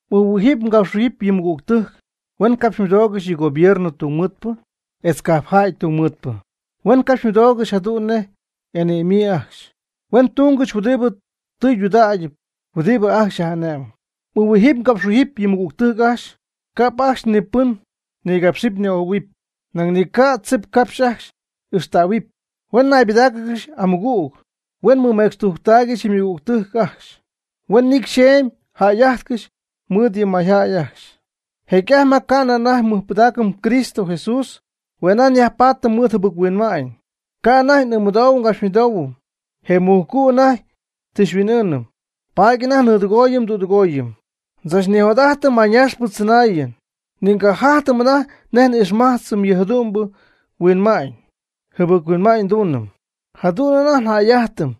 M'ɨɨhuijɨp mgapxhuijɨp yɨ mɨgügtɨjc huen capxymɨdoogɨxy yɨ gobierno ytungmɨɨdpɨ etz cajpjäy ytungmɨɨdpɨ. Huen capxymɨdoogɨxy jadu'n nej y'ane'myii ajcxy. Huen tungɨxy huɨdibɨ tɨydudägyɨp huɨdibɨ ajcxy yaj'ane'mɨp. M'ɨɨhuijɨp mgapxhuijɨp yɨ mɨgügtɨjc ajcxy ca'p ajcxy ni pɨn nigapx ni'ojɨ̈huɨp, nañ ni ca' tzipcapxy ajcxy ixtähuɨp, huen ñaybɨdáacɨgɨxy amɨgüg, huen mɨmecxtujctaaygɨxy yɨ ymɨgügtɨjc ajcxy, huen nicy xyeemy jäy'ajtcɨxy mɨɨd yɨ mayjäy ajcxy. Jecy'ajty ma ca'nɨ anajty nmɨjpɨdaacɨm Cristo Jesús, hue' anajty nyajpaatɨm mɨɨd jɨbɨc-huinma'ñ. Ca' anajty n'ɨɨmɨdoohuɨm ngapxmɨdoohuɨm. Je mujcu' anajty tɨ xyhuin'ɨɨnɨm, paady anajty nnɨɨdɨgooyɨm ndüdɨgooyɨm. Ndzachnijot'ajtɨm mayñaxpɨ tzɨnaayɨn, ni ngajajtɨm anajty nej n'ixmajtzɨm yɨ jadu'mbɨ huinma'ñ. Jɨbɨc-huinma'ñ nduunɨm. Jadu'n njäy'ajtɨm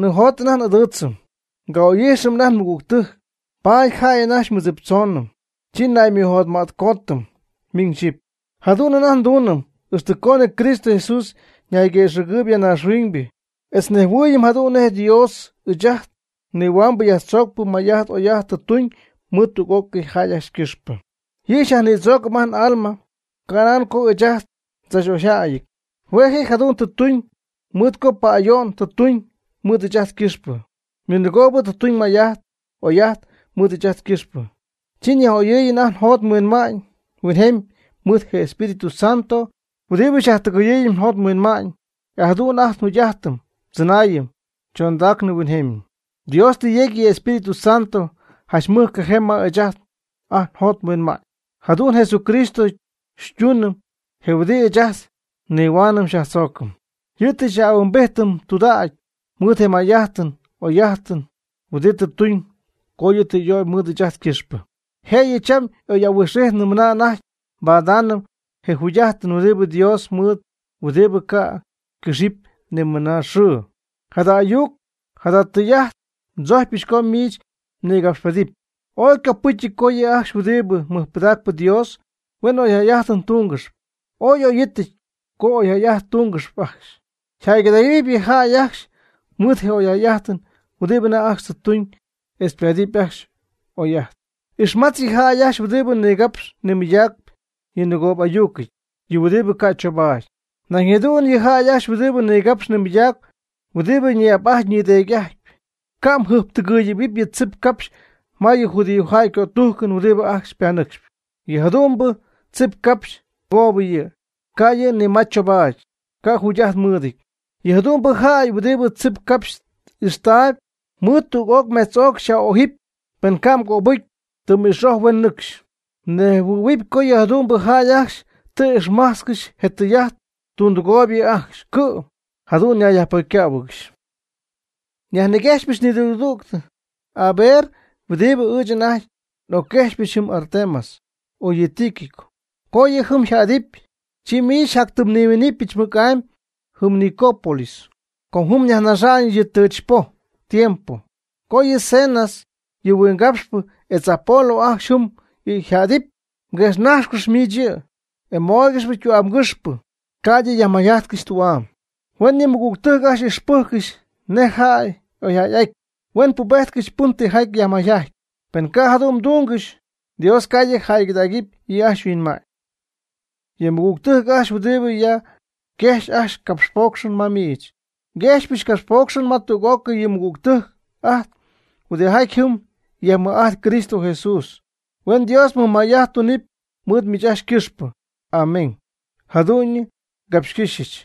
nijot anajty n'ɨdɨɨtzɨm, nga'oy'ijxɨm anajty nmɨgügtɨjc. Paady jäy anajty xymɨɨddziptzoonɨm, chi naymɨjotma'tcootɨm miñ xyɨpy. Jadu'n anajty nduunɨm ixtɨ coonɨ Cristo Jesús ñayguëxɨ̈gɨɨyb ya naaxhuiñ, etz nnejhuɨɨyɨm jadu'n nej Dios ɨɨch ajt nihuambɨ yajtzoocpɨ may'ajt oy'ajt tɨ tuñ mɨɨd tüg'ócɨy jäy ajcxy ycɨxpɨ. Yɨ' xyajnïdzoocɨm ajt n'alma canan co ɨɨch ajt ndzach'oyjäyɨty. Hue' je' jadu'n tɨ tuñ mɨɨd co pa'ayo'n tɨ yajtuñ mɨɨd ɨɨch ajt ycɨxpɨ. Ninɨgoob tɨ tuñ may'ajt oy'ajt mɨɨd ɨɨch ajt ycɨxpɨ. Chi yaj'oyɨɨyñɨ ajt njot nhuinma'ñ huinjemy mɨɨd je Espíritu Santo huɨdibɨ xyajtɨgɨɨyɨm njot nhuinma'ñ, e jadu'n ajt njugy'ajtɨn ndzɨnaayɨn chondaacnɨ huinjemy. Dios tɨ yecy yɨ Espíritu Santo janch mɨjcajee ma ɨɨch ajt njot nhuinma'ñ. Jadu'n Jesucristo xytuunɨm, je huɨdi ɨɨch ajt nihuaanɨm yajtzoocɨm. Yɨ' tɨ xyaj'ahuimbijtɨm tudägy mɨɨd je may'ajtɨn oy'ajtɨn huɨdibɨ tɨ tuñ co yɨ' tɨ y'ögy mɨɨd ɨɨch ajt ycɨxpɨ. Jëyɨ cham y'oy'ahuijxnɨty mɨna anajty nbadaanɨm je jugy'ajtɨn huɨdibɨ Dios mɨɨd huɨdibɨ ca' ycɨxɨpy ni mɨnaa xɨɨ. Jada ayuc jada tɨy'ajt ndzojcpyɨch co miich mnïgapxpedɨpy. Ooy ycopɨcyɨty co yɨ' ajcxy huɨdibɨ mɨjpɨdacp Dios huen oyjäy'ajtɨn tungɨxyp. Ooy y'oyɨty co oyjäy'ajtɨn tungɨxyp ajcxy. Yjäygɨdägɨpy yɨ jäy ajcxy mɨɨd je oyjäy'ajtɨn huɨdibɨ anajty ajcxy ytumyb etz ypaadɨpy ajcxy oy'ajt. Ixmatz yɨ jäy ajcxy huɨdibɨ nigapxy nimɨydägy yɨ nɨgoobɨ'ayucɨty, yɨ huɨdibɨ ca' choobaady. Nañ jadu'n yɨ' ajcxy huɨdibɨ nigapxp nimɨydacp huɨdibɨ ñi'ap'ajtpy ñideedy'ajtpy. Ca' mjɨjptɨgɨyɨ̈huɨpy yɨ tzip capxy ma yɨ judiojäy ycötujcɨn huɨdibɨ ajcxy ypanɨcxyp. Yɨ jadu'mbɨ tzip capxy ninɨgoob yɨ', ca' yɨ' ni ma choobaady, ca' jugy'ajt mɨɨdɨty. Yɨ jadu'mbɨ jäy huɨdibɨ tzip capxy ixtaayb, mɨɨd tüg'oc mejtz'oc myaj'ojɨpy pen ca' ycapxcöbɨcy, tɨm ix'oj, huen nɨcxy. Mnejhuɨɨyb co yɨ jadu'mbɨ jäy ajcxy tɨ ixmajtzcɨxy je tɨy'ajt, tundɨgooyb yɨ' ajcxy, cɨ'm jadu'n nayyajpocycähuɨɨygɨxy. Nyajniguexɨpɨch nidüg, aver huɨdibɨ ɨɨch anajty n'ocquejxyp yɨ Artemas o yɨ Tíquico. Co yɨ' jɨm yjädɨpy, chi miich xyjatyñiminɨpyɨch mɨc'amy jɨm Nicópolis com jɨm nyajnaxa'ñɨch yɨ tɨch poj tiempo. Co yɨ Zenas, yɨ huingapxpɨ, etz Apolo ajcxy jɨm yjädɨpy, quejxnajxcɨx miich yɨ', e mooygɨxy ytu'amgɨxpɨ ca'ydɨ ti yajmayjajtcɨxy tü'am. Huen yɨ nmɨgügtɨjc'ajt ixpɨjccɨxy nej jäy y'oyjäy'aty, huen pubejtcɨxy pɨn tijaty yajmayjajtp. Pen ca' jadu'n tungɨxy, Dios ca' yɨ' jäygɨdaacɨp yɨ' ajcxy yhuinma'ñ. Yɨ mɨgügtɨjc ajcxy huɨdibɨ ya yquejxyp ajcxy capxpoocxɨn ma miich. Nquejxpɨch ngapxpocxɨn ma tüg'ócɨy yɨ nmɨgügtɨjc ajt huɨdijaty jɨm yajmɨj'ajtp Cristo Jesús. Huen Dios mɨj may'ajt tunɨp mɨɨd miich ajcxy ycɨxpɨ. Amén. Jadu'ñyɨ ngapxcɨ́xyɨch.